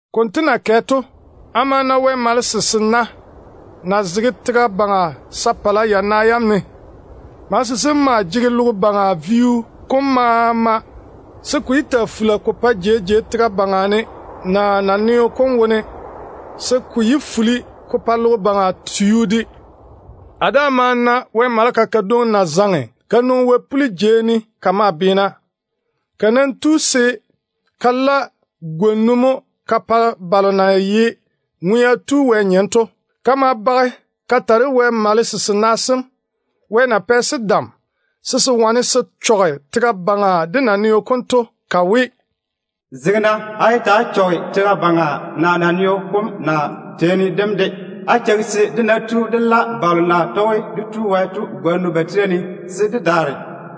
Konto na kɛ to, a ma na Wɛ malese sena na zege tega baŋa sapala yana yam ne. Malese sem maa jege logo baŋa vio kom maama se ko yé taa fula ko pae jei de jei tega baŋa ne naa naneo wone, se ko yé fuli ko pa logo baŋa tio de. A daa ma na Wɛ maleka kadwoŋi na zaŋe ka nwoŋi wɛ-puli jei ne ka maa beena. Ka nam tu se ka la gwona mo ka pa balo na ye Ŋwea Tu Wɛ nyem to. Ka ma bage ka ta de Wɛ malese sena sem, Wɛ na pɛ-se dam se se wane se chɔge tega baŋa de naneo kom to, ka we, “Zege-na. Á yé chɔge tega baŋa, naa naneo kom, naa teeni dem de. Nam cheigi-na se dé ná tu dé la dé Tu Wɛ tontoŋena bam gwona ba tira ne, se dé daare.”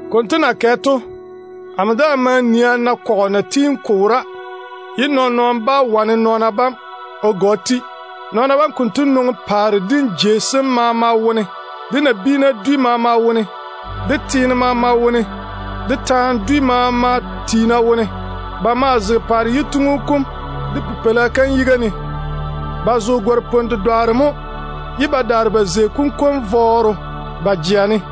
Konto na kɛ to, a ma daa nii a na nɔn-kɔgɔ na tiini ko wora, ye nɔɔn-nɔɔno bá wane nɔɔna bam o ga o ti. Nɔɔna bam konto nwoŋi paare dim jei sem maama wone, de nabiina dwi maama wone, de teene maama wone, de taana dwi maama tiina wone mo. Ba maa zege paare yituŋu kom de Pipeila kam yiga ne. Ba zo gare-napwon-dedwaaro mo, ye ba daare ba zei konkwara vɔɔro ba jea ne.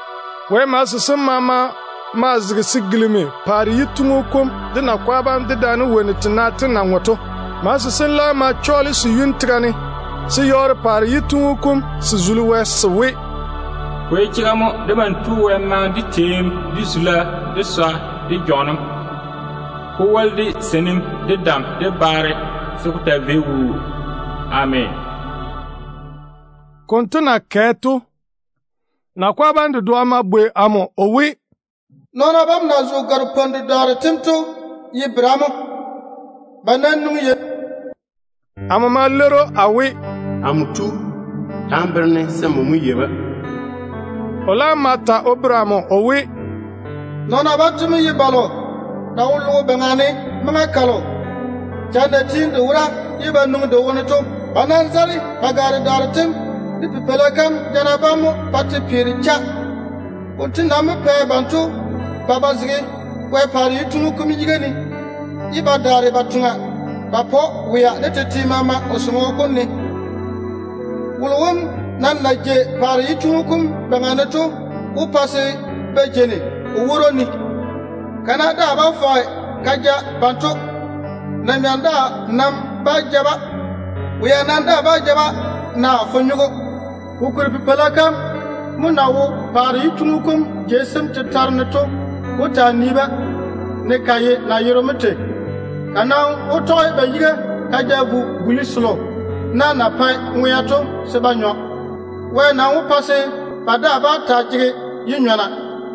Wɛ malese sem maama maa zege se gilimi paare yituŋu kom, de nakwa bam, dedaane wonnu tena tem na ŋwe to. Malese sem laam ma chɔɔle se yuni tega ne se yɔɔre paare yituŋu kom se zuli Wɛ se we: “Ko ye chega mo. Debam Tu Wɛ maŋe de teem, de zula, de swa, de lei keim, ko woli de seinim, de dam, de baare, se ko taa vei wuu. Ameena.” Konto na kɛ to, nakwa bam dedoa ma bwei amo o we, “Nɔɔna bam na zo gare-napwon-dedwaaro tem to ye bera mo? Ba nwoŋi yei ne mo?” Amo ma leiri‑o a we, “Amo tu, ta n bere-ne, se nmo mo yei-ba.” O laam ma ta o bere amo o we, “Nɔɔna banto mo ye balo na wo logo baŋa ne maŋa kalo lɛɛro na tiini te wora ye ba nwoŋi te wone to. Ba nam zare ba gwaaro tem de Pipeila kam jana bam mo pa te peere. Konto nam mo pɛ banto ba ba zege Wɛ paare yituŋu kom yiga ne, ye ba toŋe ba pa‑o wea de tete maama o sɔŋɔ kom ne. Wolo wom nam na jei paare yituŋu kom baŋa ne to wó pa ba jeini o woro ne. Kana daa bá fɔge ka ja banto. Na-nyɔm de nam bá ja-ba. Wea nam daa bá ja-ba, naa fonyogo. Kokuri Pipeila kam na wo paare yituŋu kom jei sem tetare ne to wó taa nii ba baŋa ne, ne ka ye nayero mo tei. Ka nam wó tɔge ba yiga ka ja-ba ka vo buli selo na na pae ŋwea to se ba nyɔ. Wɛ nam wó weeri nɔɔna bam maama yi-na, se ba daa yé taa jege yi-nyɔna.”